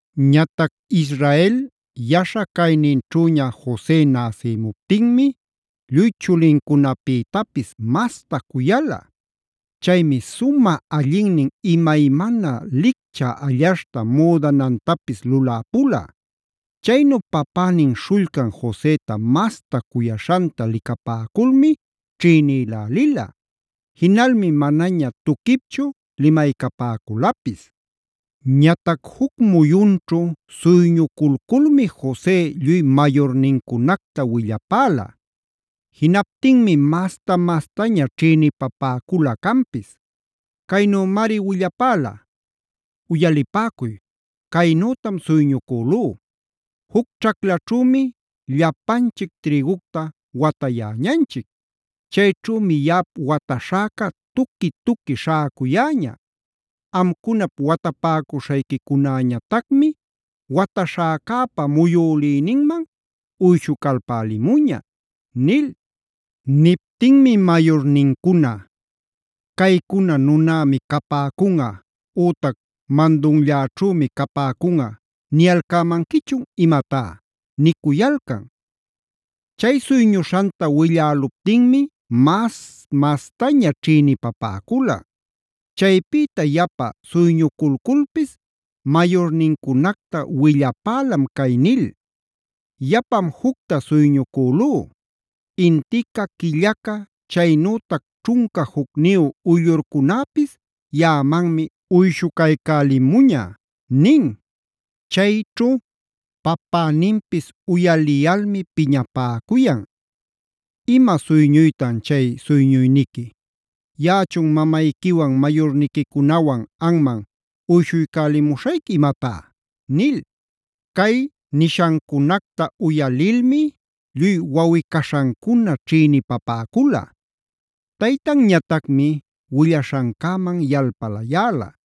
Ñatac Israela yaśha cayninćhüña Jose näsïmuptinmi lluy chulincunapïtapis masta cuyala. Chaymi sumä allinnin imaymana licchä allaśhta müdanantapis luläpula. Chaynu papänin śhullcan Joseta masta cuyaśhanta licapäculmi ćhïnïlälila. Jinalmi manaña tuquipchu limaycapäculapis. Ñatac juc muyunćhu suyñuculculmi Jose lluy mayurnincunacta willapäla. Jinaptinmi mas-mastaña ćhïnipapäcula canpis. Caynümari willapäla: “Uyalipäcuy caynütam suyñucülú: ‘Juc ćhaclaćhümi llapanchic trïgucta watayäñanchic. Chayćhümi yaꞌap wataśhäca tuqui-tuqui śhäcucuyäña. Amcunap watapäcuśhayquicunäñatacmi wataśhäcäpa muyülïninman uyshucalpälimuña’” nil. Niptinmi mayurnincuna: “¿Caycuna ‘nunämi capäcunꞌa’ ütac ‘mandunlläćhümi capäcunꞌa’ niyalcämanquichun imatá?” nicuyalcan. Chay suyñuśhanta willäluptinmi mas-mastaña ćhïnipapäcula. Chaypïta yapa suyñuculculpis mayurnincunacta willapälam cay nil: “Yapam jucta suyñucülú: Intica, quillaca, chaynütac ćhunca jucniyu uyllurcunäpis yaꞌamanmi uyshucaycälimuña” nin. Chayćhu papäninpis uyaliyalmi piñapäcuyan: “¿Ima suyñuytan chay suyñuyniqui? ¿Yaꞌachun mamayquiwan mayurniquicunawan anman uyshuycälimuśhayqui imatá?” nil. Cay nishancunacta uyalilmi lluy wawꞌi-caśhancuna ćhïnipapäcula.b Taytanñatacmi willaśhancäman yalpalayäla.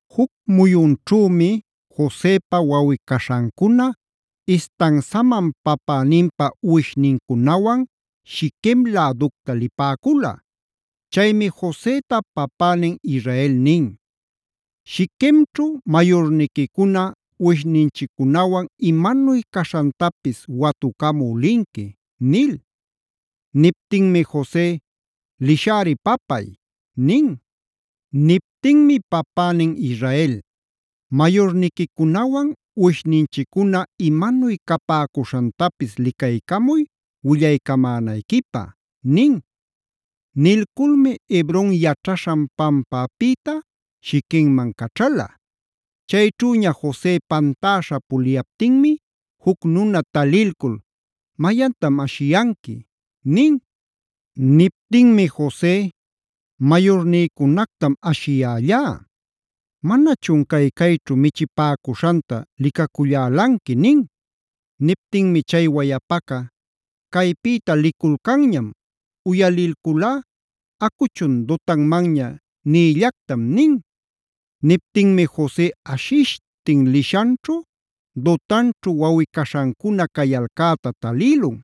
Juc muyunćhümi Josepa wawꞌi-caśhancuna istansaman papäninpa uwishnincunawan Shiquem läducta lipäcula. Chaymi Joseta papänin Israel nin: “Shiquemćhu mayurniquicuna uwishninchiccunawan imanuy caśhantapis watucamü linqui” nil. Niptinmi Jose: “Lishäri papay” nin. Niptinmi papänin Israel: “Mayurniquicunawan, uwishninchiccuna imanuy capäcuśhantapis licaycamuy willaycamänayquipä” nin. Nilculmi Hebron yaćhaśhan pampäpïta Shiquemman caćhala. Chayćhüña Jose pantäśha puliyaptinmi juc nuna talilcul: “¿Mayantam ashiyanqui?” nin. Niptinmi Jose: “Mayurnïcunactam ashiyällá. Manachun cay-cayćhu michïpäcuśhanta licacullälanqui” nin. Niptinmi chay wayapaca: “Caypïta liculcanñam, uyalilculá: ‘Acuchun Dotanmanña’ nïllactam” nin. Niptinmi Jose ashishtin lishanćhu Dotanćhu wawꞌi-caśhancuna cayalcäta talïlun.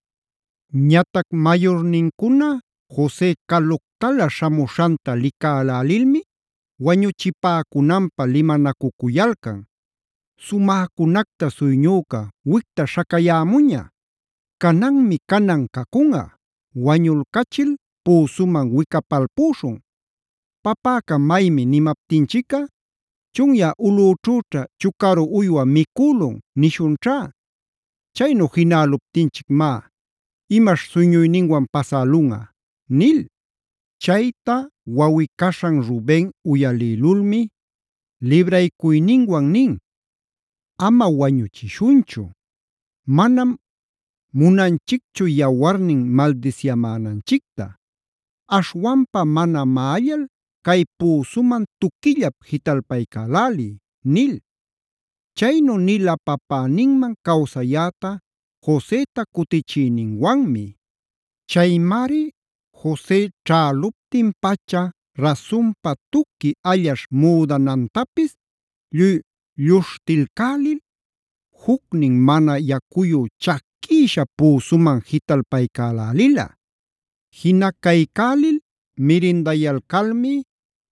Ñatac mayurnincuna Jose caluctala śhamuśhanta licälälilmi wañuchipäcunanpä limanacucuyalcan: “¡Sumäcunacta suyñüca, wicta śhacayämuña! Cananmi canan cacunꞌa, wañulcachil püsuman wicapalpüśhun. Papäca maymi nimaptinchicꞌa: ‘Chunyä ulꞌüćhüćha chucaru uywa micülun’ nishunćhá. Chaynu jinäluptinchic má, ¡imaśh suyñuyninwan pasälunꞌa!” nil. Chayta wawꞌi-caśhan Ruben uyalïlulmi libraycuyninwan nin: “Ama wañuchishunchu. Manam munanchicchu yawarnin maldisyamänanchicta. Aśhwampa mana maꞌallal cay püsuman tuquillap jitalpaycäläliy” nil. Chaynu nila papäninman cawsayäta Joseta cutichïninwanmi. Chaymari Jose ćhäluptin-pacha rasunpa tuqui allaśh müdanantapis lluy lluśhtilcälil, jucnin mana yacuyu chaquïsha püsuman jitalpaycälälila. Jinacaycälil mirindayalcalmi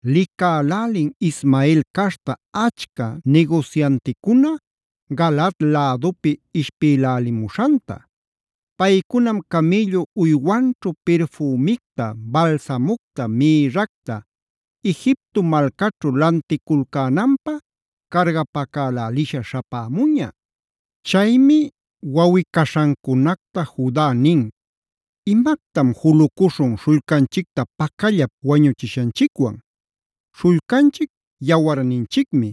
licälälin Ismael caśhta achca nigusyanticuna Galaad lädupi ishpïlälimuśhanta. Paycunam camïllu uywanćhu pirfümicta, balsamucta, mïrracta, Egipto malcaćhu lanticulcänanpä cargapacälälisha śhapämuña. Chaymi wawꞌi-caśhancunacta Juda nin: “Imactam julucuśhun śhullcanchicta pacallap wañuchishanchicwan. Śhullcanchic yawarninchicmi.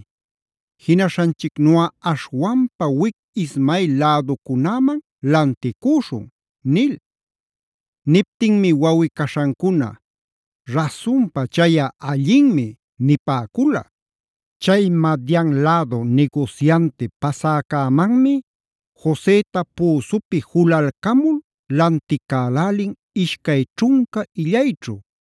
Jinaśhanchicnuꞌa aśhwanpa wic Ismael läducunäman lanticüśhun” nil. Niptinmi wawꞌi-caśhancuna: “Rasunpa chayꞌa allinmi” nipäcula. Chay Madian lädu nigusyanti pasäcämanmi Joseta püsupi julalcamul lanticälälin ishcay ćhunca illayćhu.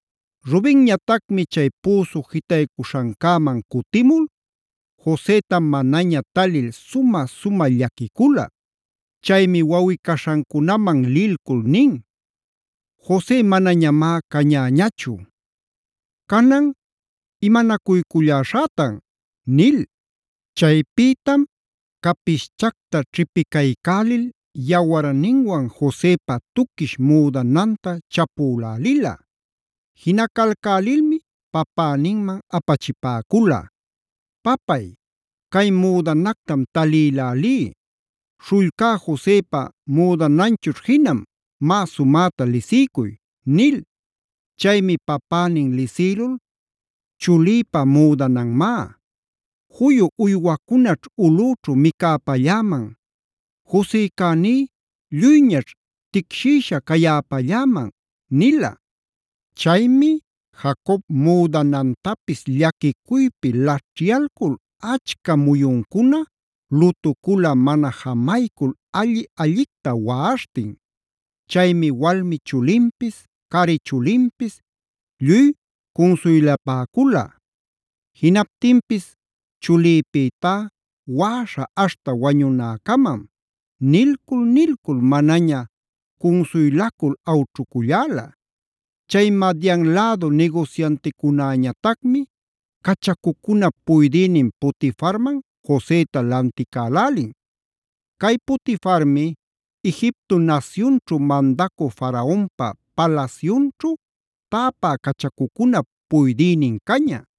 Rubenñatacmi chay püsu jitaycuśhancäman cutimul Joseta manaña talil sumä-sumäta llaquicula. Chaymi wawꞌi-caśhancunaman lilcul nin: “¡Jose manañamá cañäñachu! Canan ¿imanacuyculläśhätan?” nil. Chaypïtam capischacta ćhipicaycälil yawarninwan Josepa tuquish müdananta chapülälila. Jinacalcälilmi papäninman apachipäcula: “Papay, cay müdanactam talïlälí, śhullcá Josepa müdananchućh jinam, má sumäta lisiycuy” nil. Chaymi papänin lisïlul: “Chulïpa müdananmá; juyu uywacunaćh ulꞌüćhu micäpalläman, Josecäní lluyñaćh ticshïsha cayäpalläman” nila. Chaymi Jacob müdanantapis llaquicuypi laćhyalcul achca muyuncuna lutucula mana jamaycul alli-allicta waꞌaśhtin. Chaymi walmi chulinpis, cari chulinpis lluy cunsuylapäcula. Jinaptinpis: “Chulïpïtá waꞌaśha aśhta wañunäcamam” nilcul-nilcul, manaña cunsuylacul awćhuculläla. Chay Madian lädu nigusyanticunäñatacmi cachacucunap puydïnin Potifarman Joseta lanticälälin. Cay Potifarmi Egipto nasyunćhu mandacü Faraonpa palasyunćhu täpä cachacucunap puydïnin caña.